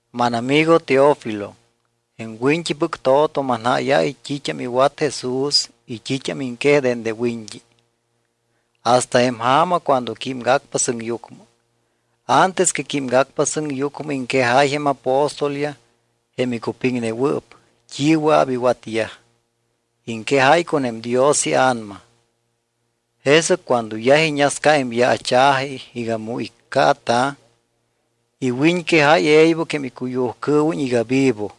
Mánamigo Teófilo, jém wint́ipɨc to̱to manjáyáy t́it́am iwat Jesús y t́it́am iŋquej dende wiñt́i hasta jém ja̱ma cuando químgacpa sɨŋyucmɨ. Antes que químgacpa sɨŋyucmɨ iŋquejáy jém apóstolyaj, jém icupiŋnewɨɨp, t́i wɨa̱p iwatyaj. Iŋquejáy con jém Dios iA̱nama. Jesɨc cuando yaj iñasca jém yaacha̱ji iga mu iccaata̱, iwiñquejáy e̱ybɨc jém icuyujcɨɨwiñ iga vivo.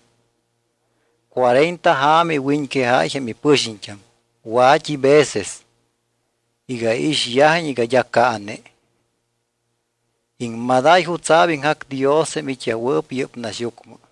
Cuarenta ja̱ma iwiñquejáy jém ipɨxiñt́am wa̱t́i veces iga iixyajiñ iga d́a caane. Iŋmadáy jutsa̱p iŋjac Dios jém it́yajwɨɨp yɨ́p naxyucmɨ.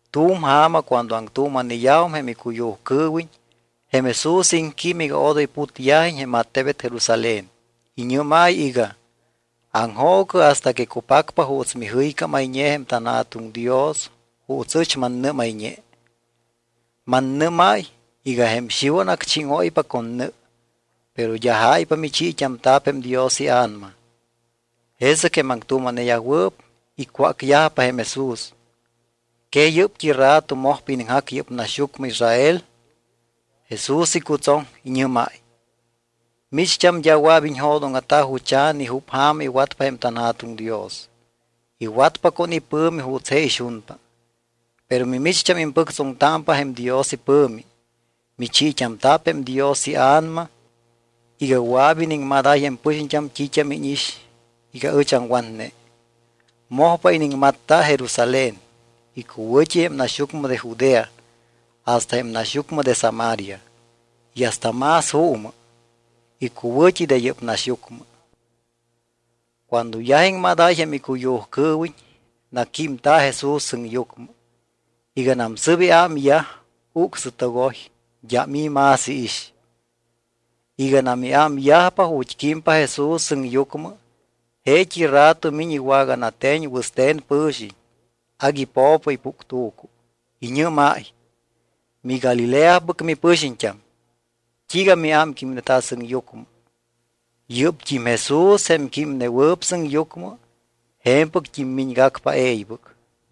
Tu̱m ja̱ma cuando aŋtuuma̱neyajum jém icuyujcɨɨwiñ, jém Jesús iŋquím iga odoy putyajiñ jém attebet Jerusalén. Iñɨ́máy iga: —Aŋjoocɨ hasta que cupacpa juuts mijɨycámayñe jém tanJa̱tuŋ Dios juuts ɨch mannɨ́mayñe. Mannɨ́máy iga jém Xiwan acchíŋóypa con nɨ, pero d́a jáypa michiit́amta̱p jém Dios iA̱nama. Jesɨc jém aŋtuuma̱neyajwɨɨp icwácyajpa jém Jesús: —¿Que yɨ́pt́i rato mojpa iniŋjac yɨ́p tannaxyucmɨ Israel? Jesús icutsoŋ, iñɨ́máy: —Micht́am d́a wɨa̱p iñjo̱dóŋa̱ta jucha̱ ni júp ja̱ma iwatpa jém tanJa̱tuŋ Dios, iwatpa con ipɨ̱mi juuts je ixunpa. Pero mimicht́am impɨctsoŋtámpa jém Dios ipɨ̱mi. Michiit́amta̱p jém Dios iA̱nama iga wɨa̱p iniŋmadáy jém pɨxiñt́am t́it́am íñix iga ɨch aŋwatne. Mojpa iniŋmatta Jerusalén, icuwɨ̱t́i jém naxyucmɨ de Judea, hasta jém naxyucmɨ de Samaria, y hasta más juumɨ, icuwɨ̱t́i de yɨ́p naxyucmɨ. Cuando yaj iŋmadáy jém icuyujcɨɨwiñ, naquímta̱ Jesús sɨŋyucmɨ. Iganam sɨ́p iámyaj, ucsɨtogoy. D́am i̱ más iix. Iganam iámyajpa ju̱t́ químpa Jesús sɨŋyucmɨ, jeet́i rato miñ iwaganate̱ñ wɨste̱n pɨ̱xiñ, agui po̱po ipuctu̱cu. Iñɨ́máy: —MiGalileapɨc mipɨxiñt́am, ¿t́iiga miámquímneta sɨŋyucmɨ? Yɨ́pt́im Jesús, jém químnewɨɨp sɨŋyucmɨ, je̱mpɨct́im miñgacpa e̱ybɨc.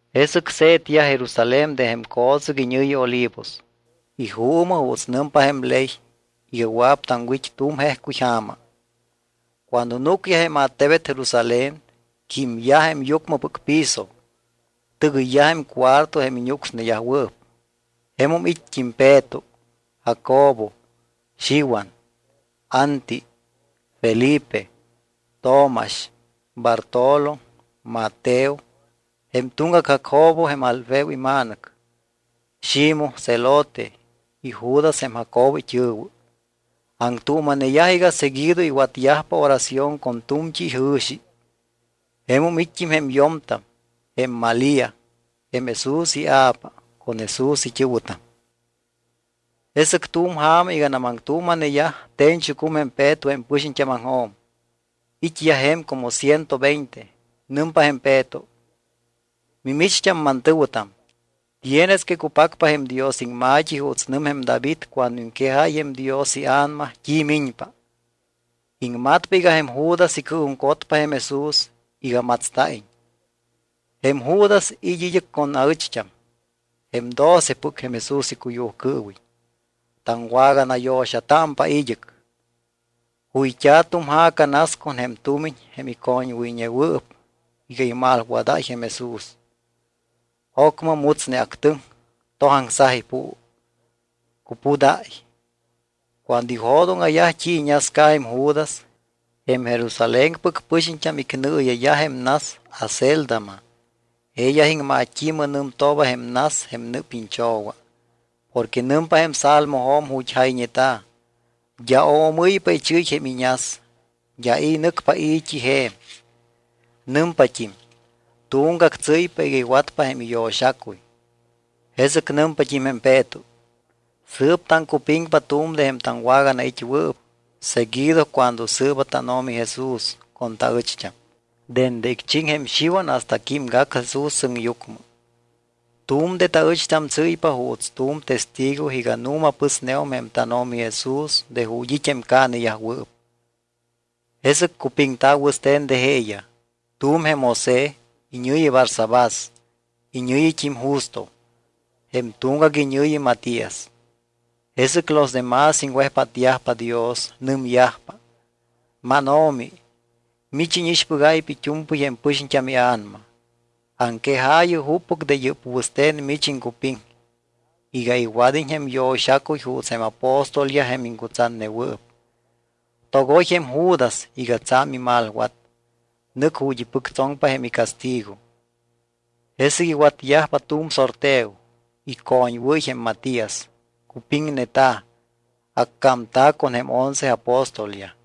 Jesɨc se̱tyaj Jerusalén de jém co̱tsɨc iñɨ̱yi Olivos. Ijuumɨ juuts nɨmpa jém ley iga wɨa̱p taŋwit́ tu̱m jejcuy ja̱ma. Cuando núcyaj jém attebet Jerusalén, químyaj jém yucmɨpɨc piso. Tɨgɨyyaj jém cuarto jém iñúcsneyajwɨɨp. Jemum it́t́im Peto, Jacobo, Xiwan, Anti, Felipe, Tomax, Bartolo, Mateo, jém tuŋgac Jacobo jém Alfeo ima̱nɨc, Ximoj Zelote y Judas jém Jacobo it́ɨ̱wɨ. Aŋtuuma̱neyaj iga seguido iwatyajpa oración con tu̱mt́i ijɨ̱xi. Jemum it́t́im jém yo̱mtam; jém Malía, jém Jesús ia̱pa con Jesús it́ɨ̱wɨtam. Jesɨc tu̱m ja̱ma iganam aŋtuuma̱neyaj, te̱ñchucum jém Peto jém pɨxiñt́ámaŋjo̱m, it́yaj je̱m como ciento veinte. Nɨmpa jém Peto: —Mimicht́am mantɨ̱wɨtam, tienes que cupacpa jém Dios iŋma̱t́i juuts nɨm jém David cuando iŋquejáy jém Dios iA̱nama t́i miñpa. Iŋmatpa iga jém Judas icɨɨjuŋcotpa jém Jesús iga matsta̱iñ. Jém Judas it́ id́ɨc con aɨcht́am jém docepɨc jém Jesús icuyujcɨɨwiñ. Taŋwaganayo̱xatámpa id́ɨc. Juyt́a̱ tu̱m ja̱ca nas con jém tumiñ jém icoñwɨyñewɨɨp iga imalwadáy jém Jesús. Ocmɨ mutsneactɨŋ, tojaŋsaj ipuu, cupudáy. Cuando ijo̱dóŋa̱yaj t́i iñasca jém Judas, jém Jerusalénpɨc pɨxiñt́am icnɨɨya̱yaj jém nas Acéldama. Jeeyaj iŋmat́i̱mɨ nɨmtooba jém nas jém nɨɨpiñ cho̱wa. Porque nɨmpa jém Salmojo̱m ju̱t́ jayñeta̱: D́a oomɨ́ypa ichɨ́y jém iñas. D́a i̱ nɨcpa i̱t́i je̱m. Nɨmpat́im: Tuŋgac tsɨ́ypa iga iwatpa jém iyo̱xacuy. Jesɨc nɨmpat́im jém Peto: —Sɨɨp taŋcupiŋpa tu̱m de jém taŋwaganait́wɨɨp seguido cuando sɨɨba tánO̱mi Jesús con taɨcht́am, dende icchiŋ jém Xiwan hasta químgac Jesús sɨŋyucmɨ. Tu̱m de taɨcht́am tsɨ́ypa juuts tu̱m testigo iga nu̱ma pɨsneum jém tánO̱mi Jesús de ju̱t́ it́ jém caaneyajwɨɨp. Jesɨc cupiŋta̱ wɨste̱n de jeeyaj. Tu̱m jém José, iñɨ̱yi Barsabás, iñɨ̱yit́im Justo. Jém tuŋgac iñɨ̱yi Matías. Jesɨc los demás iŋwejpátyajpa Dios. Nɨmyajpa: —MánO̱mi, mich íñixpɨgáypa it́u̱mpɨy jém pɨxiñt́am ia̱nama. Aŋquejaayɨ juppɨc de yɨ́p wɨste̱n mich iŋcupiŋ iga iwad́iñ jém yo̱xacuy juuts jém apóstolyaj jém iŋcutsatnewɨɨp. Togoy jém Judas iga tsa̱m imalwat. Nɨc ju̱t́ ipɨctsoŋpa jém icastigo. Jesɨc iwatyajpa tu̱m sorteo. Icoñwɨ́y jém Matías, cupiŋneta̱. Accámta̱ con jém once apóstolyaj.